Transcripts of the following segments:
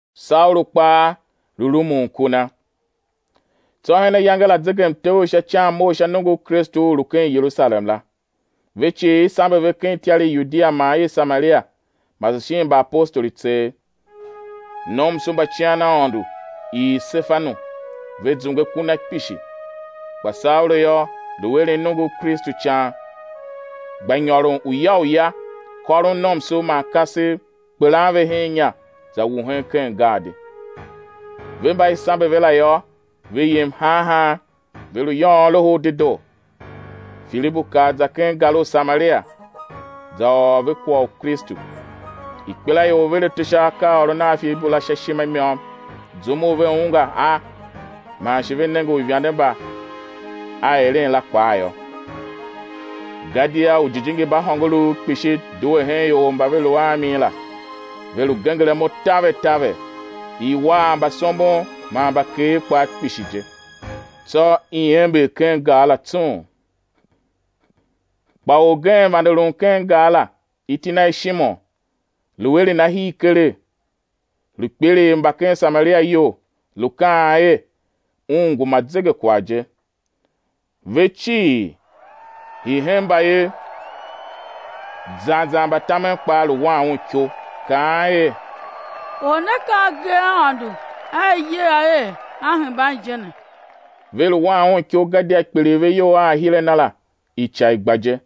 Saulu kpaa lu rumun ku na. Tsô hen ayange la zegemtev u sha ican mough sha nongo u Kristu u u lu ken Yerusalem la. Ve cii i sambe ve ken ityar i Yudia man i Samaria, mase shin mbaapostoli tseegh. Nomso mba cian Aôndo ii Sefanu; ve zungwe ku na kpishi. Kpa Saulu yô, lu eren nongo u Kristu ican gba nyôron uya uya, kôron nomso man kasev, kpelan ve hen inya za wuhen ken gaadi. Ve mba i sambe ve la yô, ve yem han han, ve lu yôôn Loho u Dedoo. Filibu kar za ken gar u Samaria, za ôr ve kwagh u Kristu. Ikpelaior ver ato sha akaaôron a Filibu la sha ishima i môm zum u ve ungwa a man shi ve nenge uivande mba a eren la kpaa yô. Gadia ujijingi mba hôngorouv kpishi due hen ior mba ve lu a mi la, ve lu genger imo taver taver; i war mbasombon man mbakeer kpaa kpishi je. Tsô i ember ken gar la tsung. Kpa orgen vande lun ken gar la, iti na er Shimon, lu eren ahir keregh, lu kpiligh mba ken Samaria iyol, lu kaan er un ngu ma zegekwagh je. Ve cii, hii hen mbayev zan zan mbatamen kpaa lu wan un iko, kaan er: Or ne ka agee a Aôndo a i yer a er a hemban je ne. Ve lu wan un iko, gadia kpiligh ve iyol a ahir a na la ica i gba je.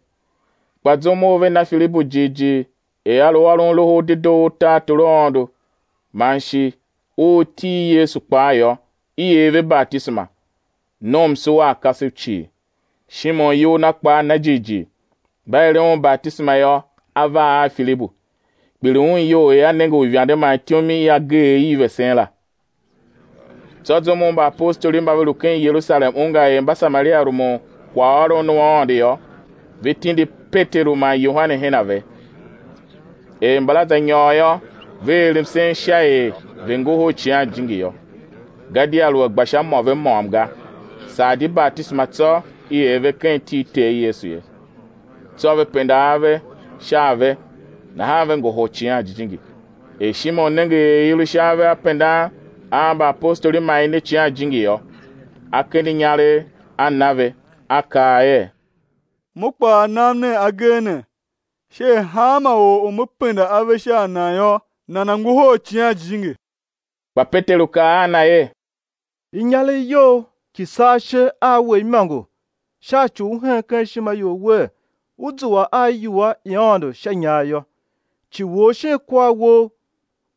Kpa zum u ve na Filibu jighjigh er a lu ôron Loho u Dedoo u tartor u Aôndo man shi u iti i Yesu kpaa yô, i er ve batisema, nomso a kasev cii, Shimon iyol na kpaa na jighjigh; mba eren un batisema yô, a var a Filibu; kpiligh un iyol er a nenge uivande man ityom i agee i vesen la. Tsô zum u mbaapostoli mba ve lu ken Yerusalem ungwa er Mbasamaria rumun kwaghôron u Aôndo yô, ve tindi Peteru man Yohane her a ve. Er mbala za nyôr yô, ve er msen sha er ve̱ ngohol Icighan Jijingi yô; gadia lu a gba sha mô ve môm ga, saa di batisema tsô i er ve ken iti i Ter Yesu ye. Tsô ve penda ave sha a ve, nahan ve ngohol Icighan Jijingi. Er Shimon nenge er i lu sha ave a pendan a mbaapostoli man i ne Icighan Jijingi yô, a kende inyaregh, a na ve, a kaa er: Mo kpaa, nam nen agee ne, sha er hanma or u me penda ave sha a nan yô, nana̱ ngohol Icighan Jijingi. Kpa Peteru kaa a na er: Inyaregh you ki̱ saa ishe a we imôngo, sha ci u u hen ken ishima you wer, ú zua a iwua i Aôndo sha inyar yô. Ci wou shin kwar wou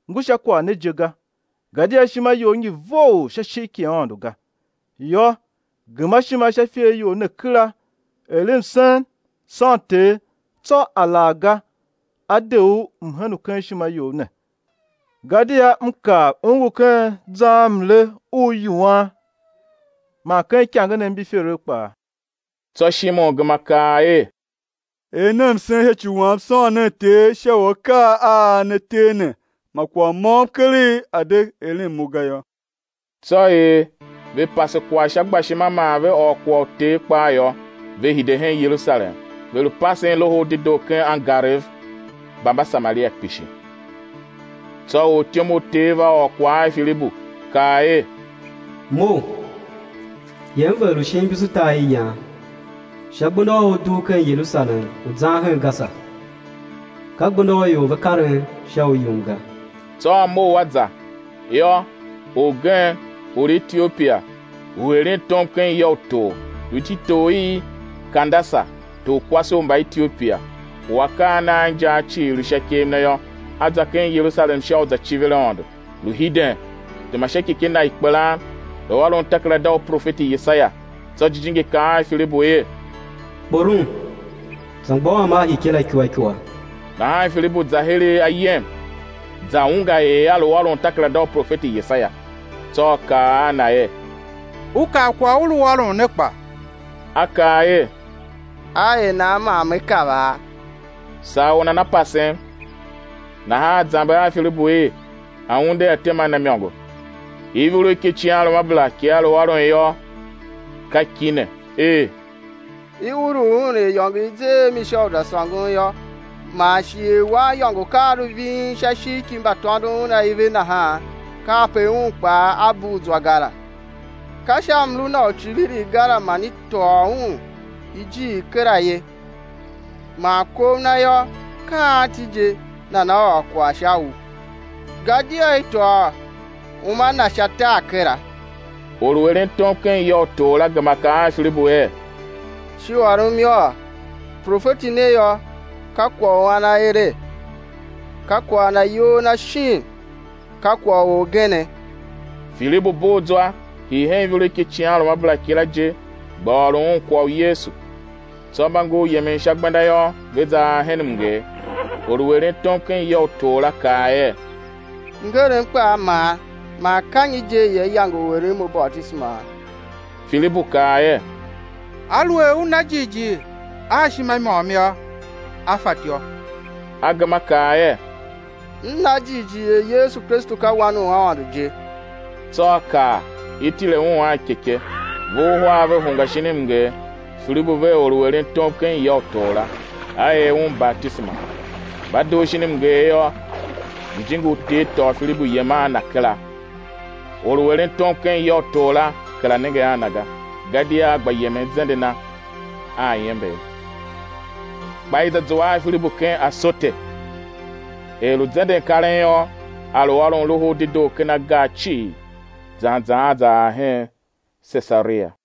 ngu sha kwagh ne je ga, gadia ishima you ngi vough sha ishigh ki Aôndo ga. Yô, gema ishima sha ifer you ne kera, er msen, sôn Ter, tsô alaghga á de u mhen u ken ishima you ne. Gadia m kav u ngu ken zarmle u yuan man ken ikangenev mbi iferev kpaa. Tsô Shimon gema kaa er: Er nen msen sha ci wam sôn nen Ter sha u akaa a ne ter ne, ma kwagh môm keregh a̱ de eren mo ga yô. Tsô er ve pase kwagh sha gbashima man ve ôr kwagh u Ter kpaa yô, ve hide hen Yerusalem, ve lu pasen Loho u Dedoo ken angarev mba Mbasamaria kpishi. Tsô ortyom u Ter va ôr kwagh a Filibu, kaa er: Mough, yem vegher u shin imbusutariyan, sha gbenda u u dugh ken Yerusalem u zan hen Gasa, ka gbenda u ior ve karen sha u yum ga. Tsô a mough a za. Yô, orgen, or u Etiopia, u eren tom ken ya u tor, lu ititor i Kandasa, torkwase u Mbaetiopia, u akaa a na a injaa cii lu sha ikev na yô, a za ken Yerusalem sha u za civir Aôndo, lu hiden, tema sha ikyekye na i kpelan, lu ôron takerada u profeti Yesaia. Tsô Jijingi kaa a Filibu er: Kporom, za mgbôghom a ikyekye la ikua ikua. Nahan Filibu za heregh ayem, za ungwa er lu ôron takerada u profeti Yesaia. Tsô a kaa a na er: U kav kwagh u u lu ôron ne kpa? A kaa er: Á er nan man me kavaa? Saa or nana pasem. Nahan a zamber a Filibu er a̱ unde a̱ tema a na imôngo. Ivurugh ki icighanruamabera ki a lu ôron yô, ka ki ne er: I ulugh Un er iyôngo i i ze a mi sha u za sôngon yô, man shi er waniyôngo ka a lu ving sha ishigh ki mbatôndon un aive nahan, kape Un kpaa A bugh zwa ga la. Ka sha mlu Na u icivirigh ga la man i tôô Un ijir kera ye; man kov Na yô, ka anti je nana ôr kwagh sha u? Gadia i tôô uma Na sha tar kera. Or u eren tom ken ya u tor la gema kaa a Filibu er: Shi ôrom yôô; profeti ne yô, ka kwagh u an a ere? Ka kwagh na iyol na shin ka kwagh u orgene? Filibu bugh zwa, hii hen ivurugh ki icighanruamabera kila je, gba ôron un kwagh u Yesu. Tsô mba ngur yemen sha gbenda yô, ve za ar hen mnger. Or u eren tom ken ya u tor la kaa er: Mngerem kpaa man, man ka nyi je i yange u eren mo batisema? [ Filibu kaa er: Aluer u na jighjigh a ishima i môm yô, á fatyô. A gema a kaa er: M na jighjigh er Yesu Kristu ka Wan u Aôndo je.] Tsô a kaa, i̱ tile un a ikyekye; ve uhar ve hungwa shin mnger, Filibu vea or u eren tom ken ya u tor la; a er un batisema. Mba dugh shin mnger yô, Jijingi u Ter tôô Filibu yem a na kera, or u eren tom ken ya u tor la kera nenge a na ga, gadia a gba yemen zende na a iember. Kpa i za zua a Filibu ken Asote. Er lu zenden karen yô, a lu ôron Loho u Dedoo ken agar cii zan zan a za ar hen Sesaria.